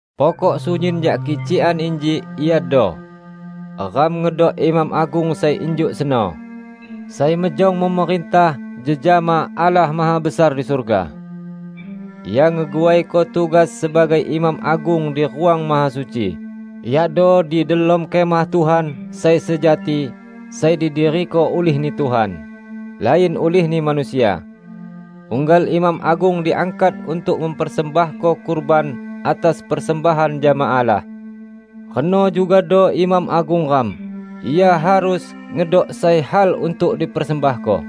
Pokok sunyin jak kicikan inji iado: Ram ngedok Imam Agung sai injuk seno, sai mejong memerintah jejama Allah Mahabesar di surga. Ia ngeguaiko tugas sebagai Imam Agung di Ruang Mahasuci, yakdo di delom Kemah Tuhan sai sejati, sai didiriko ulih-Ni Tuhan, lain ulihni manusia. Unggal imam agung diangkat untuk mempersembahko kurban atas persembahan jama Allah. Reno jugado Imam Agung ram; Ia harus ngedok sai hal untuk dipersembahko.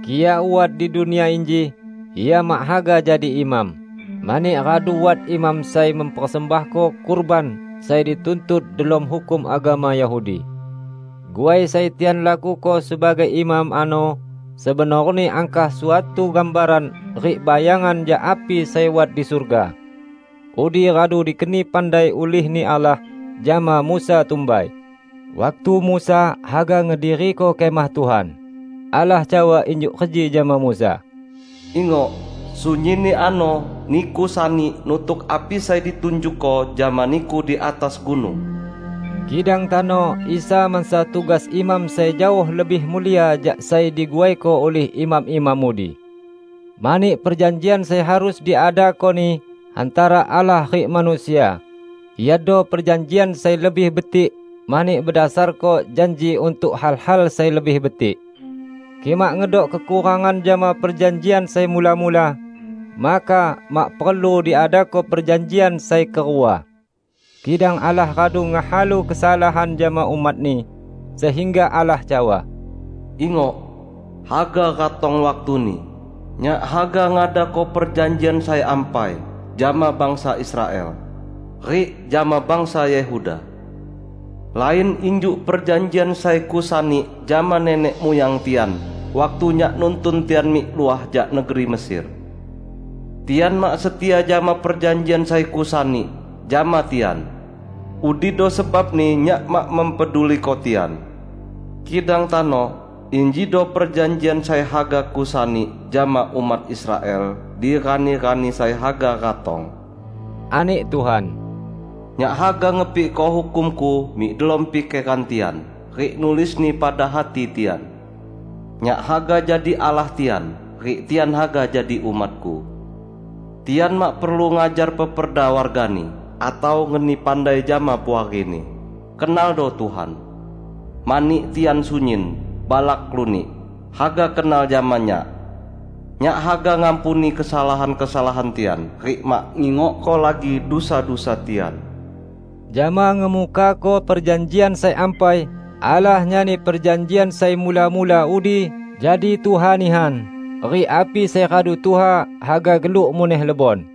Kik Ia wat di dunia inji, Ia mak haga jadi imam, mani radu wat imam sai mempersembahko kurban sai dituntut delom hukum agama Yahudi. Guai sai tian lakuko sebagai imam ano sebenorni angkah suatu gambaran rik bayangan jak api sai wat di surga. Udi radu dikeni pandai ulih-Ni Allah jama Musa tumbai, waktu Musa haga ngediriko Kemah Tuhan. Allah cawa injuk reji jama Musa, "Ingok! Sunyinni ano niku sani nutuk api sai ditunjukko jama niku di atas gunung." Kidang tano Isa mansa tugas imam sai jaoh lebih mulia jak sai diguaiko ulih imam-imam udi. Mani perjanjian sai harus diadako-Ni hantara Allah rik manusia, iado perjanjian sai lebih betik mani bedasarko janji untuk hal-hal sai lebih betik. Kik mak ngedok kekurangan jama perjanjian sai mula-mula, maka mak perlu diadako perjanjian sai kerua. Kidang Allah radu ngehalu kesalahan jama umat-Ni, sehingga Allah cawa, "Ingok, haga ratong waktuni, Nyak haga ngadako perjanjian sai ampai jama bangsa Israel, rik jama bangsa Yehuda. Lain injuk perjanjian sai Kusani jama nenek muyang tian waktu Nyak nuntun tian mik luah jak negeri Mesir. Tian mak setia jama perjanjian sai Kusani jama tian; udido sebabni Nyak mak mempeduliko tian. Kidang tano, injido perjanjian sai haga Kusani jama umat Israel di rani-rani sai haga ratong, ani Tuhan: Nyak haga ngepikko hukum-Ku mik delom pikeran tian, rik nulisni pada hati tian. Nyak haga jadi Allah tian, rik tian haga jadi umat-Ku. Tian mak perlu ngajar peperda wargani, atau ngeni pandai jama puarini, 'Kenaldo Tuhan.' Mani tian sunyin, balak lunik, haga kenal jama Nyak. Nyak haga ngampuni kesalahan-kesalahan tian, rik mak ngingokko lagi dusa-dusa tian." Jama ngemukako perjanjian sai ampai, Allah nyani perjanjian sai mula-mula udi jadi tuha nihan, rik api sai radu tuha, haga geluk muneh lebon.